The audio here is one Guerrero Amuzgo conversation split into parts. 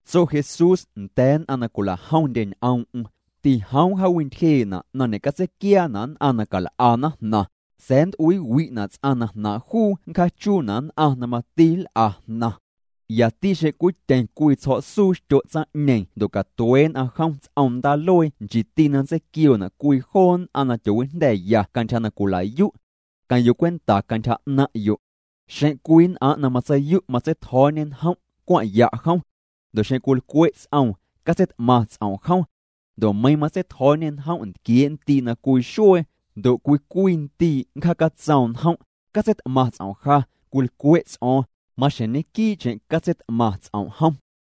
Tso Jesús nda̱a̱ nn'aⁿ na cwila'jomndye ñ'oom'm: —Tijoom jaawintyjee'na' na ñe'catseiquiaana' nn'aⁿ na cal'ana jnaⁿ, sa̱a̱ nnt'uiiwi'na' ts'aⁿ na jnaaⁿ' juu nncjaachuuna' nn'aⁿ na mati nl'ana jnaⁿ. Yati xeⁿ cwityeⁿ cwii tsjo̱'suu xtyo' tsaⁿ'ñeeⁿ ndo' catuee' nn'aⁿ jom ts'om ndaaluee nchiiti na nntseiquioona' cwii joo nn'aⁿ na tyoowijnda̱ya cantyja na cwila'yu'. Queⁿ'yo' cwenta cantyja 'naⁿ'yo'. ’Xeⁿ cwii nn'aⁿ' na matseiyu' matseitjo̱o̱ñê njom', cwaⁿ'ya' jom. Ndo' xeⁿ cwilcwe' ts'oom, catseit'maⁿ ts'om' jom. Ndo' meiiⁿ matseitjo̱o̱ñê njom' ntquiee' ndii' na cwii xuee, ndo' cwii cwii ndii' nncjaacatsoom njom': “Catseit'maⁿ ts'om' ja, cwilcwe' ts'o̱o̱ⁿ”, maxjeⁿ ñequii'cheⁿ catseit'maⁿ ts'om' jom.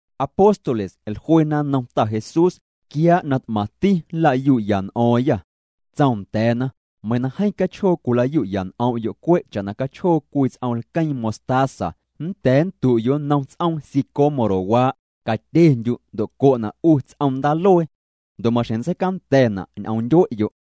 Apóstoles jluena nnom Ta Jesús: —Quiaa' na t'maⁿti nlayu'ya n'o̱o̱ⁿya. Tsoom nda̱a̱na: —Meiiⁿ na jeeⁿ cachjoo cwilayu'ya n'om'yo' cwe' cha'na cachjoo cwii ts'om lqueeⁿ mostaza, nnda̱a̱ nndu'yo' nnom ts'oom sicómorowaa': “Catyendyu' ndo' co'na' 'u ts'om ndaaluee.” Ndo' maxjeⁿ nntseicanda̱na' ñ'omndyue'yo'.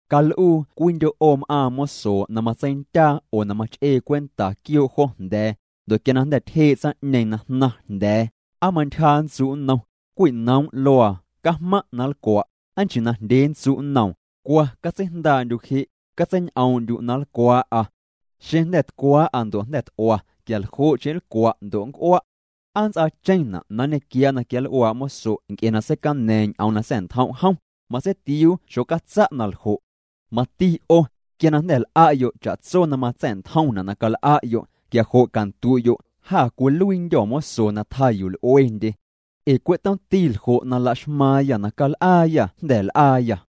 ’Cal'uu cwiindyo' 'o m'aaⁿ mosoo' na matseindyaa oo na mach'ee cwenta quioo' jo jnda̱a̱, ndo' quia jnda̱ tyjee' tsaⁿ'ñeeⁿ na jnaⁿ jnda̱a̱, ¿aa mantyja nntsu' nnom: “Cwinoom' luaa, cajmaⁿ' na nlcwa'”? ¿Aa nchii najndyee nntsu' nnoom?: “Cwa catseijndaa'ndyu' je', catseiñ'oom'ndyu' na nlcwaa'a. Xeⁿ jnda̱ tcwaa'a ndo' jnda̱ t'ua, quia ljo'cheⁿ nlcwa' ndo' nnc'ua'.” ¿Aa nnts'aacheⁿna' na nñequiaa' na quianl'uaa' moso' nc'e na seicana̱a̱ⁿ ñ'oom na sa̱'ntjom' jom? Matseitiuu xocatsa' na ljo'. Mati 'o, quia na jnda̱ l'a'yo' cha'tso na matsa̱'ntjomna' na cal'a'yo', quia jo' candu'yo': “Jâ cwiluiindyô̱ moso na tjaa yuu l'uendye. Ee cwe' tomti na laxmaaⁿyâ na cal'aayâ jnda̱ ñel'aayâ.”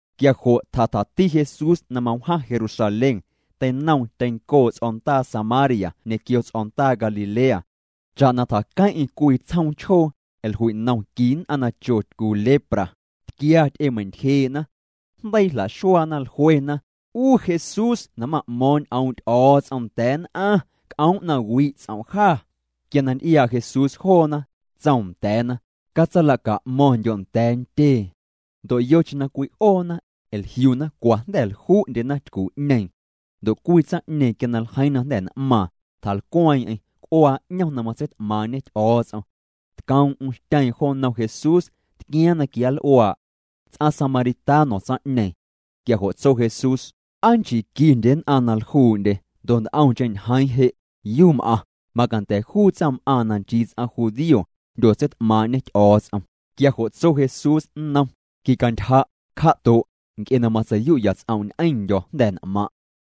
Quia jo' tjatjati Jesús na mawjaⁿ Jerusalén, teinoom tyencoo' ts'o̱ndaa Samaria ñequio ts'o̱ndaa Galilea. Cha'na tjaqueⁿ'eⁿ cwii tsjoom chjoo, jlui'nom qui nn'aⁿ na cho tycu lepra, tquia ty'emei'ntyjee'na. Jndeii jla'xuaana, jluena: —'U Jesús na ma'mo̱o̱ⁿ' ñ'oom' Ty'o̱o̱ts'om nda̱a̱ nn'aⁿ, c'oom' na wi' ts'om' jâ. Quia na nty'iaa' Jesús joona, tsoom nda̱a̱na: —Catsala'ca'mo̱ⁿndyo' nda̱a̱ ntyee. Ndo' yocheⁿ na cwi'oona, jliuna cwa jnda̱ ljuu'ndyena tycu'ñeeⁿ. Ndo' cwii tsaⁿ'ñeeⁿ, quia na ljeiiⁿ na jnda̱ n'maaⁿ, tjalcweeⁿ'eⁿ, c'uaa 'ñom na matseit'maaⁿ'ñe Ty'o̱o̱ts'om. Tcoom'm xtyeeⁿ jo nnom Jesús, tquiaaⁿ na quianl'uaa'. Ts'aⁿ samaritano tsaⁿ'ñeeⁿ. Quia jo' tso Jesús: —¿Aa nchii quindye nn'aⁿ na ljuu'ndye? Ndo' nt'omcheⁿ ñjeeⁿ je' ¿yuu m'aⁿ? Macanda̱ juu tsaⁿm'aaⁿ na nchii ts'aⁿ judío, jndyotseit'maaⁿ'ñê Ty'o̱o̱ts'om. Quia jo' tso Jesús nnom: —Quicantyja', cja'to'. Nc'e na matsei'yu'ya ts'om' ñ'eⁿndyo̱ jnda̱ n'maⁿ'.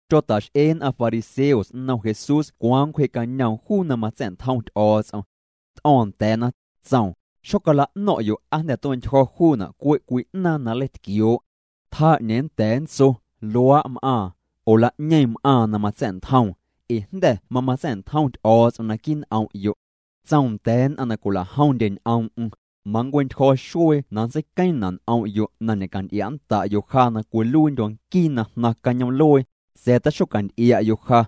Tyota'x'ee nn'aⁿ fariseos nnom Jesús cwaaⁿ nncwjee'cañoom juu na matsa̱'ntjom Ty'o̱o̱ts'om. T'o̱o̱ⁿ nda̱a̱na, tsoom: —Xocala'no̱ⁿ'yo' aa jnda̱ tue'ntyjo̱ juuna' cwe' cwii 'naaⁿ na nleitquioo'. Tjaa 'ñeeⁿ nnda̱a̱ nntso: “Luaa' m'aaⁿ”, oo “La'ñeeⁿ m'aaⁿ na matsa̱'ntjoom”, ee jnda̱ mamatsa̱'ntjom Ty'o̱o̱ts'om naquii' n'om'yo'. Tsoom nda̱a̱ nn'aⁿ na cwila'jomndye ñ'oom'm: —Manncue'ntyjo̱ xuee na nntseiqueeⁿna' n'om'yo' na ñe'canty'ia'nnda'yo' ja na cwiluiindyo̱ nquii na jnaⁿ cañoom'luee, sa̱a̱ taxocanty'ia'yo' ja.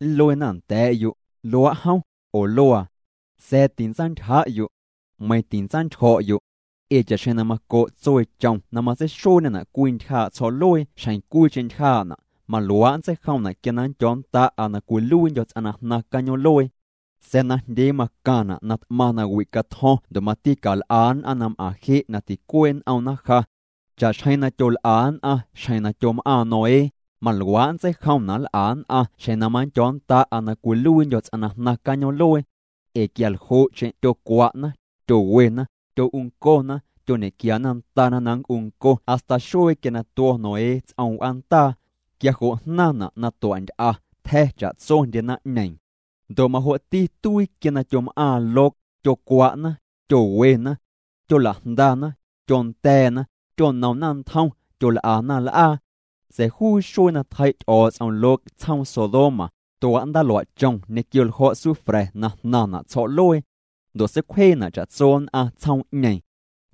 Nluena nda̱a̱'yo': “Luaa' jom”, oo “Luaa.” Sa̱a̱ tintsantyja'yo'. Meiⁿ tintsantyjo̱'yo'. Ee cha'xjeⁿ na maco' tsueechom matseixueena' cwii ntyjaa' tsjo̱'luee xjeⁿ cwiicheⁿ ntyjaa'na', maluaa' nntseijomna' quia na nndyo̱o̱nnda'a na cwiluiindyo̱ ts'aⁿ na jnaⁿ cañoom'luee. Sa̱a̱ najndyee macaⁿna' na t'maⁿ nawi' catjo̱ⁿ ndo' mati cal'a nn'aⁿ na m'aⁿ je' na ticuee' n'omna ja. Cha'xjeⁿ na tyol'a nn'aⁿ xjeⁿ na tyom'aaⁿ Noé, maluaa' nntseijomna' nl'a nn'aⁿ xjeⁿ na manndyo̱o̱nnda'a na cwiluiindyo̱ ts'aⁿ na jnaⁿ cañoom'luee. Ee quia ljo'cheⁿ tyocwa'na, tyowena. Tyo'uncona, tyoñequiana ndana na nnc'unco hasta xuee quia na tuo̱ Noé ts'om w'aandaa. Quia jo' jnaⁿna' na tua'nty'a, tja̱ cha'tsondye naⁿ'ñeeⁿ. Ndo' majo'ti tuii quia na tyom'aaⁿ Lot, tyocwa'na, tyowena. Tyola'jndana, tyonda̱a̱na. Tyonomna ntjom, tyol'ana l'aa. Sa̱a̱ juu xuee na tjei' Ty'o̱o̱ts'om Lot tsjoom Sodoma, tua' ndaaluaa' chom ñequio ljo̱' sufra̱ na jnaⁿna' tsjo̱'luee. Ndo' seicwjeena' cha'tso nn'aⁿ tsjoom' ñeeⁿ.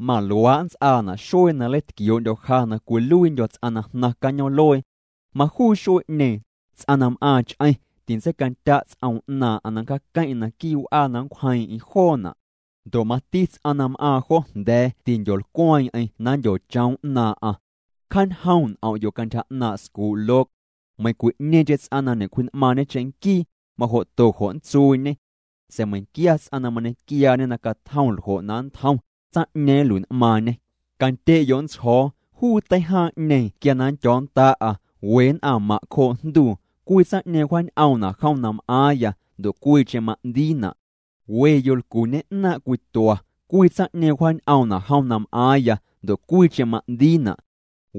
Maluaa' nnts'aana' xuee na nleitquioo'ndyo̱ ja na cwiluiindyo̱ ts'aⁿ na jnaⁿ cañoom'luee. ’Majuu xuee'ñeeⁿ, ts'aⁿ na m'aaⁿ ch'eⁿ, tintseicandya' ts'oom 'naaⁿ'aⁿ na nncjaaqueⁿ'eⁿ naquii w'aa na nncwjeeⁿ'eⁿ joona'. Ndo' majo'ti ts'aⁿ na m'aaⁿ jo jnda̱a̱ tindyolcweeⁿ'eⁿ na nndyochoom 'naaⁿ'aⁿ. Cjaañjoom' n'om'yo' cantyja 'naaⁿ' scuu' Lot. Meiⁿcwi'ñeeⁿcheⁿ ts'aⁿ na ñe'cwji'n'maaⁿñe cheⁿnquii, majo'to jo' nntsuuñe. Sa̱a̱ meiⁿnquia ts'aⁿ na mañequiaañe na catjom ljo' na nntjom, tsaⁿ'ñeeⁿ nlui'n'maaⁿñê. ’Candye'yo' nntsjo̱o̱, juu teijaaⁿ'ñeeⁿ quia na nndyo̱o̱nnda'a, we nn'aⁿ maⁿ' cjoo' jnduu, cwii tsaⁿ'ñeeⁿ wjaañ'oomna' jom na m'aaⁿya, ndo' cwiicheⁿ ma'ndiina'. We yolcu ñe'naaⁿ' cwitua, cwii tsaⁿ'ñeeⁿ wjaañ'oomna' jom na m'aaⁿya, ndo' cwiicheⁿ ma'ndiina'.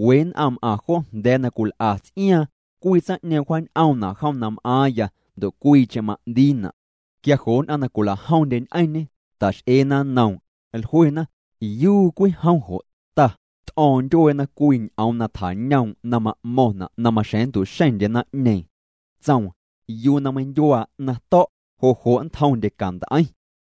We nn'aⁿ m'aⁿ jo jnda̱a̱ na cwil'a ts'iaaⁿ, cwii tsaⁿ'ñeeⁿ wjaañ'oomna' jom na m'aaⁿya, ndo' cwiicheⁿ ma'ndiina'. Quia jo' nn'aⁿ na cwila'jomndye ñ'eⁿñê, ta'x'eena nnoom, jluena: —¿Yuu cwii jom jo', Ta? T'o̱o̱ⁿ ndyueena cwii ñ'oom na tjañoom' na ma'mo̱ⁿna' na maxjeⁿ nntu'xeⁿndye naⁿ'ñeeⁿ. Tsoom: —Yuu na meindyuaa 'naⁿ to̱', jo' jo' nntjomndye cant'eiⁿ.